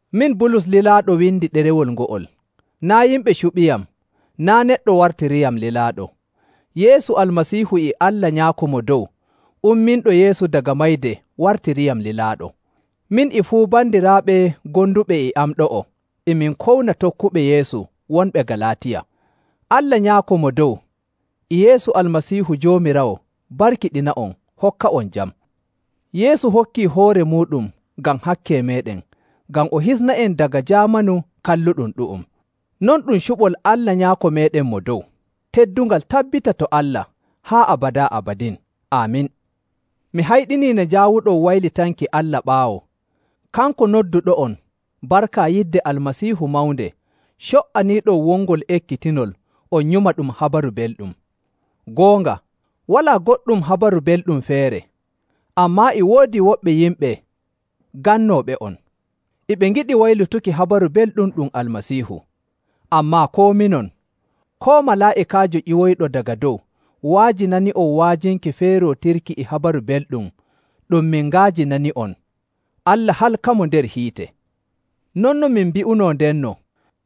Min Bulus lilaaɗo windi ɗerewol ngo'ol. Naa' yimɓe cuɓiyam, naa' neɗɗo wartiriyam lilaaɗo. Yeesu Almasiihu e Allah Nyaako Mo Dow, umminɗo Yeesu daga mayde wartiriyam lilaaɗo. Min e fuu bandiraaɓe gonduɓe e am ɗo'o e min kowna tokkuɓe Yeesu wonɓe Galaatiya. Allah Nyaako Mo Dow e Yeesu Almasiihu Joomiraawo barkiɗina'on hokka'on jam. Yeesu hokkii hoore muuɗum ngam hakke meeɗen ngam o hisna'en daga jaamanu kalluɗum ɗu'um. Non ɗum cuɓol Allah Nyaako meeɗen Mo Dow. Teddungal tabbita to Allah haa abadaa abadin. Aamin. Mi hayɗinii nde njaawuɗon waylitanki Allah ɓaawo, kanko nodduɗo'on barka yidde Almasiihu mawnde co''aniiɗon wongol ekkitinol on nyuma ɗum Habaru Belɗum. Goonga, walaa goɗɗum Habaru Belɗum feere, ammaa e woodi woɓɓe yimɓe gannooɓe'on. E ɓe ngiɗi waylutuki Habaru Belɗum ɗum Almasiihu. Ammaa koo minon, koo malaa'ikaajo ƴiwoyɗo daga dow wa'ajinani'on wa'ajinki feerootirki e Habaru Belɗum ɗum min nga'ajinani'on, Allah halkamo nder hiite. Non no min mbi'unoo ndenno,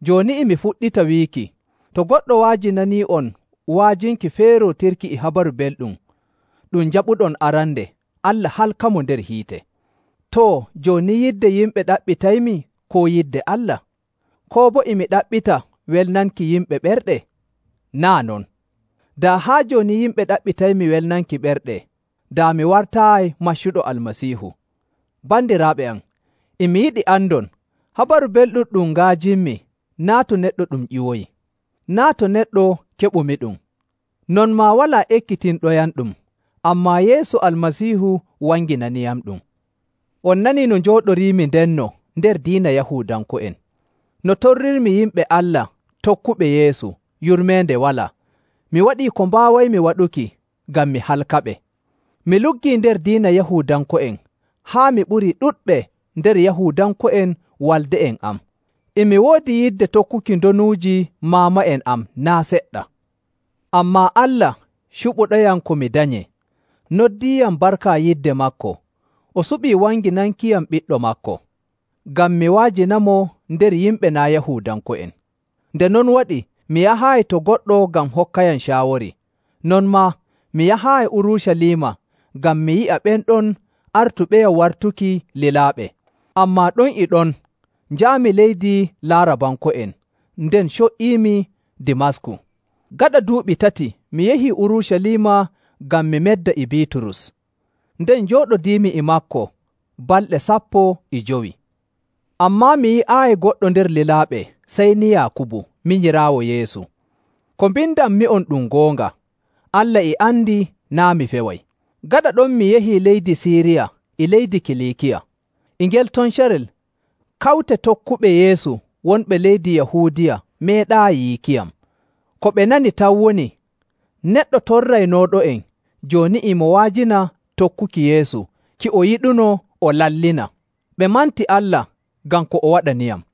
jooni e mi fuɗɗita wiiki: To goɗɗo wa'ajinanii'on wa'ajinki feerootirki e Habaru Belɗum ɗum njaɓuɗon arande, Allah halkamo nder hiite. Too, jooni yidde yimɓe ɗaɓɓitaymi, koo yidde Allah? Koo boo e mi ɗaɓɓita welnanki yimɓe ɓerɗe? Naa' non! Daa haa jooni yimɓe ɗaɓɓitaymi welnanki ɓerɗe, daa mi wartaayi maccuɗo Almasiihu. Bandiraaɓe am, e mi yiɗi andon, Habaru Belɗum ɗum nga'ajinmi, naa' to neɗɗo ɗum ƴiwoyi. Naa' to neɗɗo keɓumiɗum, non maa walaa ekkitinɗoyamɗum, ammaa Yeesu Almasiihu wanginaniyamɗum. On nanii no njooɗoriimi ndenno nder diina Yahuudanko'en, no torrirmi yimɓe Allah tokkuɓe Yeesu, yurmeende walaa, mi waɗii ko mbaawaymi waɗuki ngam mi halkaɓe. Mi luggii nder diina Yahuudanko'en haa mi ɓurii ɗuɗɓe nder Yahuudanko'en walde'en am, e mi woodi yidde tokkuki ndonuuji maama'en am naa' seɗɗa. Ammaa Allah, cuɓuɗoyam ko mi danyee, noddiyam barka yidde maako, o suɓi wanginankiyam Ɓiɗɗo maako, ngam mi wa'ajinamo nder yimɓe naa' Yahuudanko'en. Nde non waɗi, mi yahaayi to goɗɗo ngam hokkayam caawori, non maa mi yahaayi Urucaliima ngam mi yi'a ɓen ɗon artuɓeyam wartuki lilaaɓe. Ammaa ɗon e ɗon njaami leydi Laarabanko'en, nden co''iimi Dimasku. Gaɗa duuɓi tati mi yahii Urucaliima ngam mi medda e Biiturus, nden njooɗodiimi e maako balɗe sappo e jowi. Ammaa mi yi'aayi goɗɗo nder lilaaɓe sey ni Yaakubu, minyiraawo Yeesu. Ko mbindanmi'on ɗum goonga. Allah e andi naa' mi feway. Gaɗa ɗon mi yahii leydi Siiriya e leydi Kiliikiya. E ngel ton carel, kawte tokkuɓe Yeesu wonɓe leydi Yahuudiya meeɗaayi yiikiyam. Ko ɓe nani tan woni, “Neɗɗo torraynooɗo'en, jooni e mo wa'ajina tokkuki Yeesu ki o yiɗunoo o lallina!” Ɓe manti Allah ngam ko o waɗaniyam.